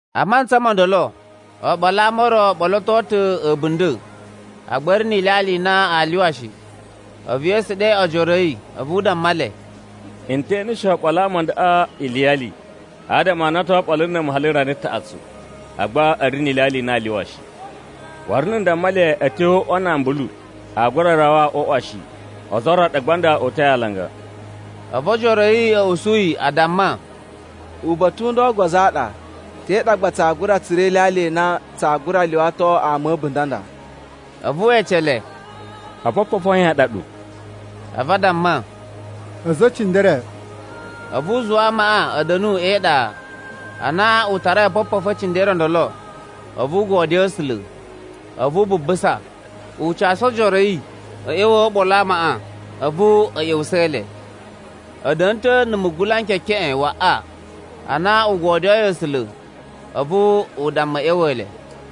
A mantsa mo ndolo, oɓolo a ama o ro o ɓoloto ta̱ a̱bunda̱, agba a̱ ri ni ilyalya i na aa lyuwa shi. A̱vu Yesu ɗe ojoro a̱ yi, a̱vu u damma le, “N te eneshe oɓolo a ama ndaꞌa iliyali, adama a na o to oɓolo na̱ mu hali rana taꞌatsu, agba a̱ ri ni ilyalya i na aa lyuwa shi. Waru na̱ n damma le a̱ tyo o uꞌwa na ambulu, aa gura rawa o uꞌwa shi, ozo o ro ɗa nda gba o uta̱i alanga.” A̱vu ojoro a̱ yi a̱ usu yi, a damma, “Uba̱ta̱ u nda ogozo a ɗa, te ɗa gba tsaa gura tsura̱ ilyalya i na tsaa gura lyuwato ama a̱ a̱bunda̱ a nda?” A̱vu we ece le, “Opopofu a yan a ɗa ɗu?” A̱vu a damma, “A̱za̱ e cindere.” A̱vu u zuwa amaꞌa a̱ da̱nu e iɗa. Ana u tarai opopofu e cindere o ndolo, a̱vu u godyoo A̱sula̱, a̱vu u bubusa, u casu ojoro a̱ yi a̱ ꞌya̱wa̱a̱ oɓolo a amaꞌa. A̱vu a̱ ꞌya̱wusa̱a̱ le. A̱ da̱na̱ ta̱ na̱ mugula n kekeꞌen waꞌa. Ana u godyoyi A̱sula̱, a̱vu u damma a̱ ꞌya̱wa̱a̱ le.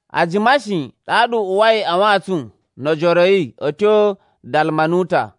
A jima shi, ɗaɗa u uwai a wantsun no ojoro a̱ yi a̱ tyo Dalmanuta.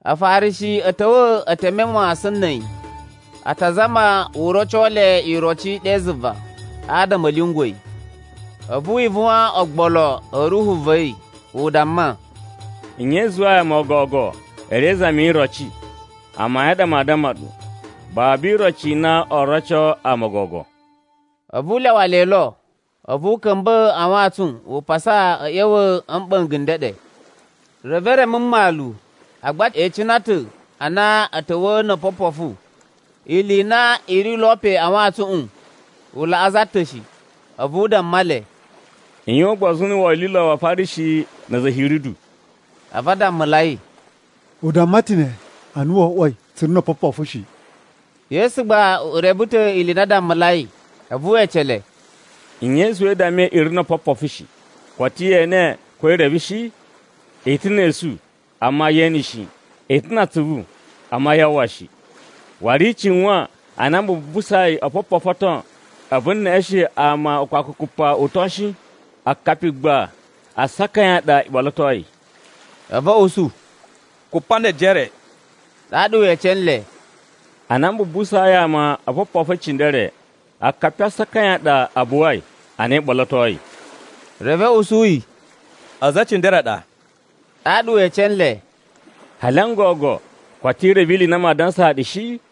Afarishi a̱ ta̱wa̱ e teme mawasan na̱ a̱yi, a ta zama u roco le iroci ɗe zuva, adama a̱ lyungwa̱ yi. A̱vu wi ivuwan ogbolo a̱ ruhu va̱ yi, u damma, “Nye i zuwai ama o gogo a̱ ri e izami yi iroci? Amayun a ɗa n damma nɗu, babu iroci i na oo roco ama o gogo.” A̱vu u lyawa le lo, a̱vu u ka̱mba̱ a wantsun u pasa a̱ ꞌya̱wa̱ a̱ mɓa̱nga̱ n ndeɗe. Reve e reme mmalu agba e icina ta̱ a na a̱ ta̱wa̱a̱ no opopofu, ili i na i ri lo le pe a wantsuꞌun u laꞌa za ta̱ shi. A̱vu u damma le, “I yuwan ugbozu na̱ wolilo wa Afarishi na̱ a̱za̱ a̱ Hiridu.” A̱vu a dammulai, “U damma ta̱ ne ana wo oꞌwoi tsu ri no opopofu shi.” Yesu gba u reve ta̱ ili i na a dammulai, a̱vu we ece le, “Nye i zuwai i dammai i ri no opopofu shi? Koto ye ene ko i reve shi? I ta̱ ne esu, amma yee ene shi. I ta̱ na atsuvu, amma yaa uwwa shi. Waru i cuwan ana m bubusai opopofu o ton, a̱vu n neꞌeshen ama ukpakukupa uton shi? Akapi gba asaka a yan a ɗa i ɓolotoi?” A̱vu a̱ usu, “Kupa ne ejere.” Ɗaɗa we ece nle, “Ana m bubusayi ama opopofu e cindere, akapi a asaka a yan a ɗa a buwai ana i ɓolotoi?” Reve a̱ usu yi “A̱za̱ e cindere a ɗa.” Ɗaɗa we ece nle, “Hali n gogo koto i reve ili i na maa dansaa ɗu shi?”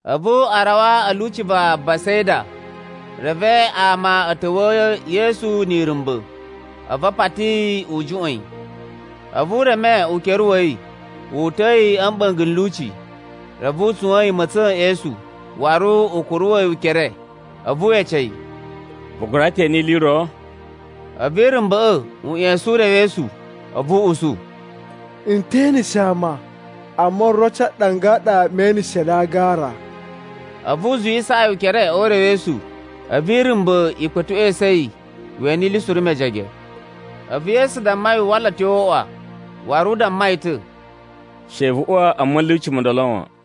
A̱vu a rawa a̱ lyuci va Besaida. Reve ama a̱ ta̱wa̱a̱ Yesu ni irumba̱, a̱vu a pati yi u juꞌwa̱n yi. A̱vu u reme ukere wa̱ yi, wu uta̱a̱ yi a̱ mɓa̱nga̱ n lyuci. Reve u tsuwa̱a̱n yi ma̱tsa̱n e esu, waru u kuruwa̱ yi ukere, a̱vu we ece yi, “Vu gura ta̱ ene ili i ro?” A̱vu irumba̱ꞌa̱ u ꞌya̱sa̱n urewesu, a̱vu u usu, “N te eneshe ama. Amma oroci a ɗanga a ɗa mee eneshe le a agara.” A̱vu u zuwisaa yi ukere o urewesu. A̱vu irumba̱ i kpa̱tuꞌwa̱ esu yi we ene ili suru mejege. A̱vu Yesu damma yi u wala a̱ tyo o uꞌwa, waru u damma yi ta̱, “She vu uwa a ma̱lyuci mo ndolo wan.”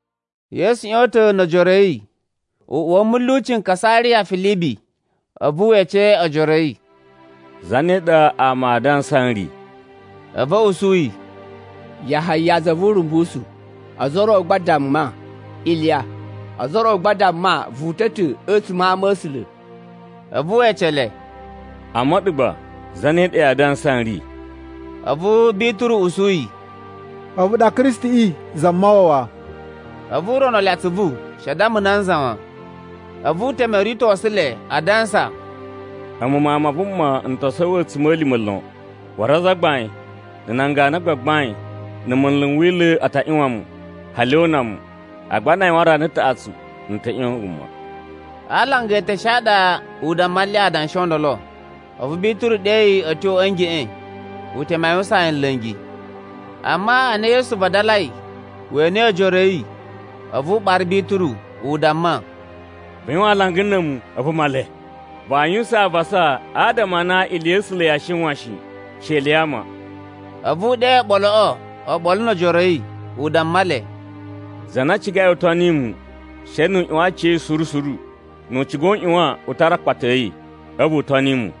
Yesu ꞌyon ta̱ no ojoro a̱ yi, u uwa mulyuci n Kasariya Filibi. A̱vu we ece ojoro a̱ yi, “Zane ɗa ama aa dansa n ri?” A̱vu a̱ usu yi, “Yahaya za vu Urumbusu, ozo o ro gba a damma, Iliya, ozo o ro gba a damma vu uta̱ ta̱ a̱tsuma̱ a ama̱sula̱.” A̱vu we ece le, “Amma a̱ɗu gba, zane ɗa yaa dansa n ri?” A̱vu Bituru usu yi, “A̱vu ɗa Kristiꞌi Zamawawa.” A̱vu u rono le atsuvu she a damma nanza wan. A̱vu u teme o ritosu le, a dansa, “A̱mu Mawun ma Vuma n to sowo a̱tsuma̱lima̱ lon. Waru azagbain, na̱ nan ganu a gbagbain, na̱ munlu n Wila̱ a ta ꞌyuwan mu, hali o una mu. Agba na a yuwan rana taꞌatsu, n ta̱ ꞌyon wuma.” A alanga eteshe a ɗa u damma nle adanshi o ndolo. A̱vu Bituru ɗe yi a̱ tyo a̱ ngeꞌen, u teme a yuwusaan yi nla̱ngi. Amma ana Yesu vadalai, we enei ojoro a̱ yi, a̱vu u ɓara Bituru, u damma, “Vu yuwan alanga na̱ a̱mu, a̱vu Male! Vaa yuwusan avasa adama a na ili ya̱ A̱sula̱ yaa shiwan shi, she ili ya ama.” A̱vu u ɗe oɓoloꞌo oɓolo no ojoro a̱ yi, u damma le, “Za na cigai u toni mu, she nu u ꞌyuwan aciya̱yi suru suru, nu u ciga u ꞌyuwan u tara akpata a̱ yi, a̱vu u toni mu.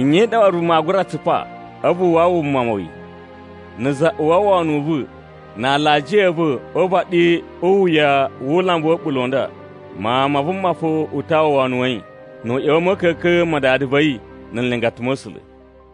Nye waru vuma aa gura tsupa, a̱vu u wawa wuma wa̱ yi? Na̱ za uwwa wono u va̱ na alajiya a̱ va̱ o uvaɗi u iwuya wu ulambu wa̱ a̱ɓula̱ u nda, Mawun ma Vuma fo u ta uwwa wono wa̱ yi, nu u ꞌya̱wa̱ a̱ ma̱ka̱ka̱n ma Dada va̱ yi na̱ nlingata ma̱ A̱sula̱.”